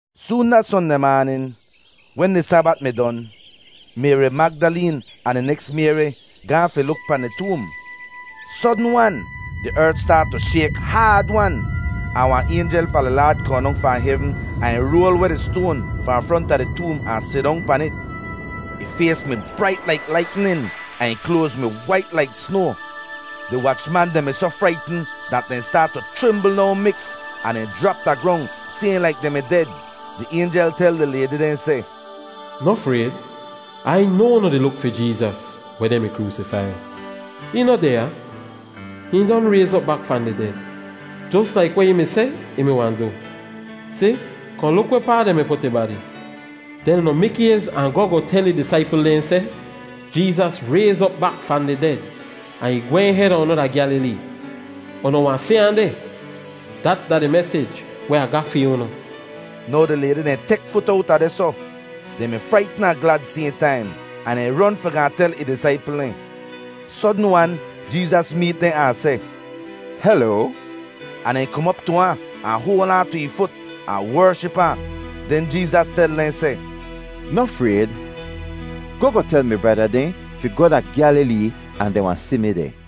Soon da Sondeh maanin, wen di Sabat mi don, Mayri Magdaleen ahn di neks Mayri gaahn fi luk pahn di toom. Sodn-wan di ert staat tu shayk haad-wan, ahn wahn aynjel fahn di Laad kohn dong fahn hevn ahn ih roal weh di stoan fahn fronta di toom ahn sidong pan it. Ih fays mi brait laik laitnin ahn ih kloaz mi wait laik snoa. Di wachman dehn mi soh fraitn dat dehn staat tu chrimbl no miks ahn dehn jrap da grong sayhn laik dehn mi ded. Di aynjel tel di laydi dehn seh, “Noh frayd! Ai noa unu di luk fi Jeezas weh dehn mi kroosifai. Hihn noh deh ya; hihn don rayz op bak fahn di ded, jos laik weh ih mi seh ih mi wahn du. Si, kohn luk wehpaa dehn mi put ih badi, den unu mikays ahn goh goh tel ih disaipl dehn seh, ‘Jeezas rayz op bak fahn di ded ahn ih gwehn heda unu da Gyalilee. Unu wahn si ahn deh.’ Dat da di mesij weh Ah ga fi unu.” Now di laydi dehn tek fut owta dehsoh; dehn mi fraitn ahn glad sayhn taim, ahn dehn ron fi gaahn tel ih disaipl dehn. Sodn-wan Jeezas meet dehn ahn seh, “Heloa!” Ahn dehn kom op tu ahn, ahn hoal aan tu ih fut ahn wership ahn. Den Jeezas tel dehn seh, “Noh frayd; goh goh tel mi brada dehn fi goh da Gyalilee ahn dehn wahn si mi deh.”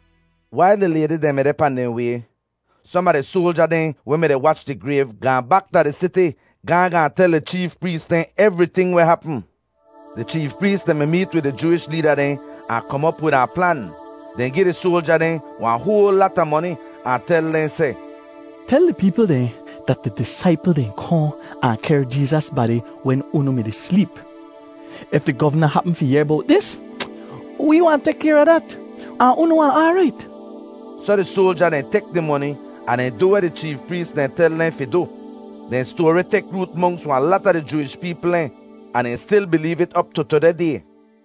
Wail di laydi dehn mi deh pahn dehn way, som a di soalja dehn weh mi-di wach di grayv gaahn bak da di siti gaahn gaahn tel di cheef prees dehn evriting weh hapm. Di cheef prees dehn mi meet wid di Jooish leeda dehn ahn kom op wid wahn plan. Dehn gi di soalja dehn wahn hoal lata moni ahn tel dehn seh, “Tel di peepl dehn dat di disaipl dehn kohn ahn kehr Jeezas badi wen unu mi-di sleep. If di govna hapm fi yehr bowt dis, wee wahn tek kayr a dat, ahn unu wahn aarait.” Soh di soalja dehn tek di moni ahn dehn du weh di cheef prees dehn tel dehn fi du. Dehn stoari tek root monks wahn lata di Jooish peepl dehn, ahn dehn stil bileev it op tu tudeh day.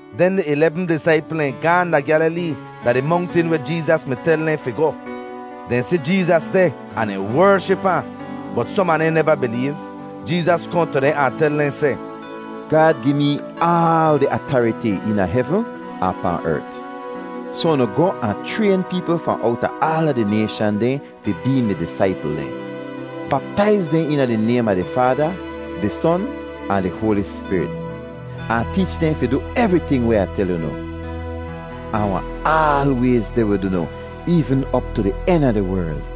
Den di ilebm disaipl dehn gaahn da Gyalilee da di mongtin weh Jeezas mi tel dehn fi goh. Dehn si Jeezas deh ahn dehn wership ahn, bot som a dehn neva bileev. Jeezas kohn tu dehn ahn tel dehn seh, “Gaad gi mee aal di atariti eena hevn ahn pahn ert; soh unu goh ahn chrayn peepl fahn owta aala di nayshan dehn fi bee mi disaipl dehn. Baptaiz dehn eena di naym a di Faada, di Son ahn di Hoali Spirit, ahn teech dehn fi du evriting weh Ah tel unu. Ah wahn aalwayz deh wid unu eevn op tu di en a di werl.”